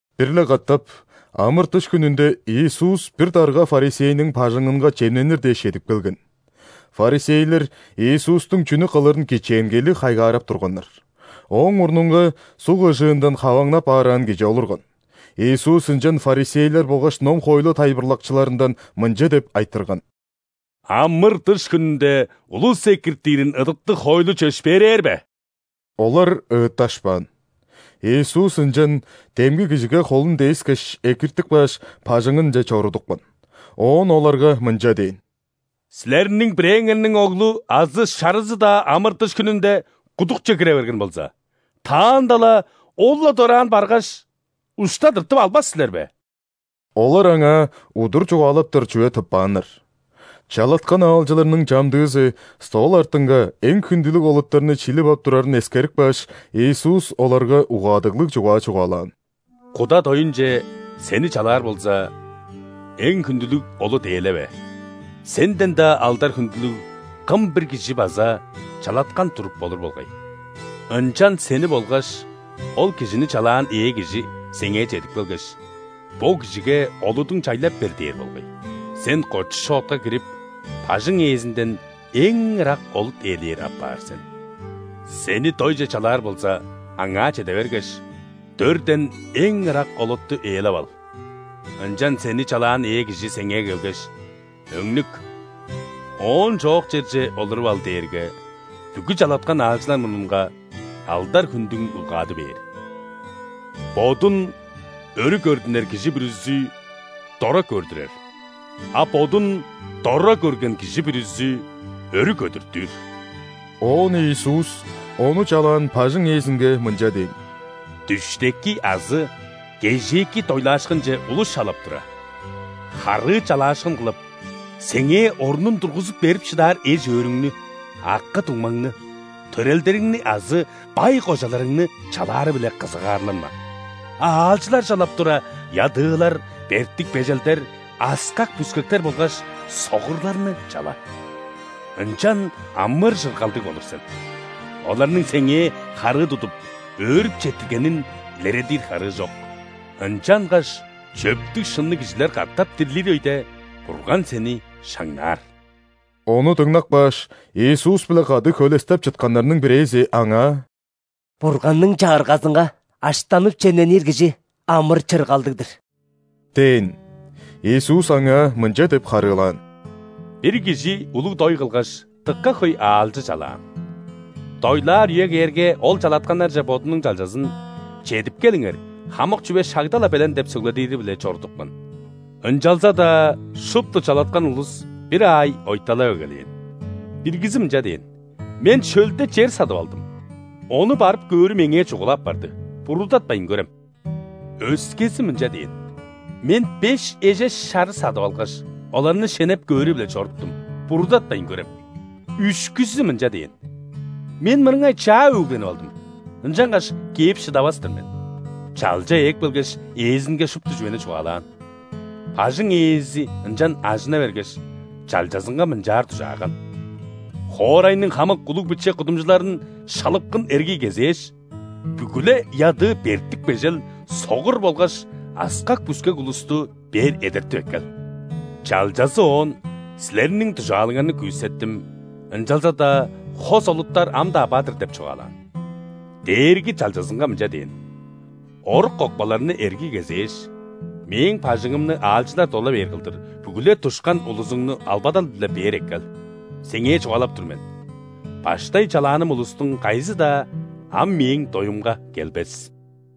Бир-ле катап ·амыр-дыш хүнүнде Иисус бир дарга ·фарисейниң бажыңынга чемненир дээш чедип келген. Фарисейлер Иисустуң чүнү кылырын кичээнгейлиг хайгаарап турганнар. Ооң мурнунга суг ыжыындан хаваңнап аараан кижи олурган. Иисус ынчан фарисейлер болгаш ном-хоойлу тайылбырлакчыларындан мынча деп айтырган: «Амыр-дыш хүнүнде улус экиртирин ыдыктыг хоойлу чөпшээрээр бе?» Олар ыытташпаан. Иисус ынчан демги кижиге холун дээскеш, экиртип кааш, бажыңынче чорудупкан. Оон оларга мынча дээн: «Силерниң бирээңерниң оглу азы шарызы-даа амыр-дыш хүнүнде кудукче кире берген болза, таанда-ла ол-ла дораан баргаш, ушта тыртып албас силер бе?» Олар аңаа удур чугаалаптар чүве тыппааннар. Чалаткан аалчыларның чамдыызы стол артынга эң хүндүлүг олуттарны шилип ап турарын эскерип кааш, Иисус оларга угаадыглыг чугаа чугаалаан: «Куда доюнче сени чалаар болза, эң хүндүлүг олут ээлеве, сенден-даа алдар-хүндүлүг кым-бир кижи база чалаткан туруп болур болгай. Ынчан сени болгаш ол кижини чалаан ээ кижи сеңээ чедип келгеш: „Бо кижиге олудуң чайлап бер“ – дээр болгай. Сен кочу-шоотка кирип, бажың ээзинден эң ырак олут ээлээр апаар сен. Сени дойже чалаар болза, аңаа чеде бергеш, дөрден эң ырак олутту ээлеп ал, ынчан сени чалаан ээ кижи сеңээ келгеш: „Өңнүк, оон чоок черже олуруп ал“ – дээрге, бүгү чалаткан аалчылар мурнунга алдар-хүндүң улгады бээр. Бодун өрү көрдүнер кижи бүрүзү дора көрдүрер, а бодун дора көрген кижи бүрүзү өрү көдүртүр». Оон Иисус Ону чалаан бажың ээзинге мынча дээн: «Дүштеки азы кежээки дойлаашкынче улус чалап тура, харыы чалаашкын кылып, сеңээ орнун тургузуп берип шыдаар эш-өөрүңнү, акы-дуңмаңны, төрелдериңни азы бай кожаларыңны чалаары-биле кызыгаарланма. А аалчылар чалап тура, ядыылар, бертик-бежелдер, аскак-бүскектер болгаш согурларны чала. Ынчан амыр-чыргалдыг болур сен: оларның сеңээ харыы тудуп, өөрүп четтиргенин илередир харыы чок, ынчангаш чөптүг-шынныг кижилер катап дирлир өйде Бурган сени шаңнаар». Ону дыңнап кааш, Иисус-биле кады хөлестеп чытканнарның бирээзи Аңаа: «Бурганның Чагыргазынга аштанып-чемненир кижи амыр-чыргалдыг-дыр!» – дээн. Иисус аңаа мынча деп харыылаан: «Бир кижи улуг дой кылгаш, дыка хөй аалчы чалаан. Дойлаар үе кээрге, ол чалатканнарже бодунуң чалчазын: „Чедип келиңер, хамык чүве шагда-ла белен“ деп сөгледири-биле чорудупкан. Ынчалза-даа шупту чалаткан улус бир аай ойталап эгелээн. Биргизи мынча дээн: „Мен шөлде чер садып алдым, ону барып көөрү меңээ чугула апарды, буруудатпайн көрем“. Өскези мынча дээн: „Мен беш эжеш шары садып алгаш, оларны шенеп көөрү-биле чоруптум, буруудатпайн көрем“. Үшкүзү мынча дээн: „Мен мырыңай чаа өгленип алдым, ынчангаш кээп шыдавас-тыр мен“. Чалча ээп келгеш, ээзинге шупту чүвени чугаалаан. Бажың ээзи ынчан ажына бергеш, чалчазынга мынчаар дужааган: „Хоорайның хамык улуг-биче кудумчуларын шалыпкын эргий кезээш, бүгү-ле ядыы, бертик-бежел, согур болгаш аскак-бүскек улусту бээр эдертип эккел“. Чалчазы оон: „Силерниң дужаалыңарны күүсеттим, ынчалза-даа хос олуттар ам-даа бар-дыр“ – деп чугаалаан. Дээрги чалчазынга мынча дээн: „Орук-кокпаларны эргий кезээш, мээң бажыңымны аалчылар дола бээр кылдыр, бүгү-ле душкан улузуңну албадал-биле бээр эккел. Сеңээ чугаалап тур мен: баштай чалааным улустуң кайызы-даа ам мээң доюмга келбес“».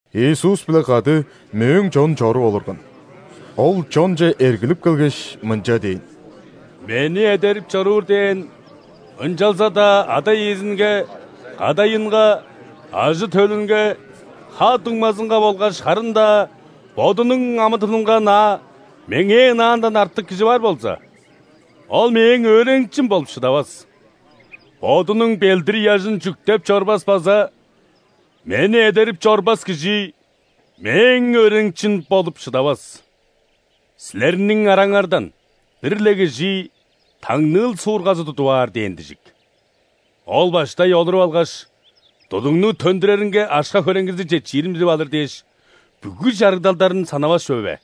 Иисус-биле кады мөөң чон чоруп олурган. Ол чонче эргилип келгеш, мынча дээн: «Мени эдерип чоруур дээн, ынчалза-даа ада-иезинге, кадайынга, ажы-төлүнге, ха-дуңмазынга болгаш харын-даа бодунуң амы-тынынга ынаа Меңээ ынаандан артык кижи бар болза, ол Мээң өөреникчим болуп шыдавас. Бодунуң ·белдир-ыяжын чүктеп чорбас база Мени эдерип чорбас кижи Мээң өөреникчим болуп шыдавас. Силерниң араңардан бир-ле кижи таңныыл суургазы тудуп аар дээн дижик. Ол баштай олуруп алгаш, тудугну төндүреринге акша-хөреңгизи четчирин билип алыр дээш, бүгү чарыгдалдарын санавас чүве бе?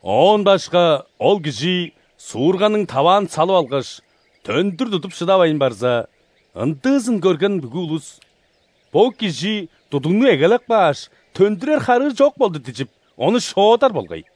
Оон башка, ол кижи суурганың таваан салып алгаш, төндүр тудуп шыдавайн барза, ындыызын көрген бүгү улус: „Бо кижи тудугну эгелеп кааш, төндүрер харыы чок болду“ – дижип, ону шоодар болгай.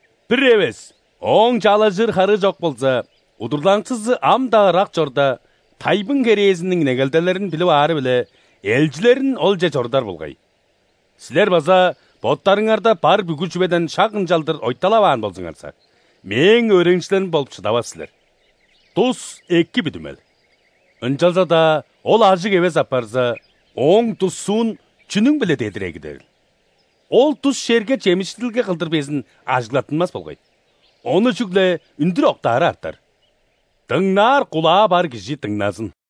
Бир эвес ооң чаалажыр харыы чок болза, удурланыкчызы ам-даа ырак чорда, тайбың керээзиниң негелделерин билип аары-биле, элчилерин олче чорудар болгай. Силер база боттарыңарда бар бүгү чүведен шак ынчалдыр ойталаваан болзуңарза, Мээң өөреникчилерим болуп шыдавас силер. Дус – эки бүдүмел, ынчалза-даа ол ажыг эвес апарза, ооң дуссуун чүнүң-биле дедир эгидерил? Ол дус черге чемишчидилге кылдыр безин ажыглаттынмас болгай, ону чүгле үндүр октаары артар. Дыңнаар кулаа бар кижи дыңназын!»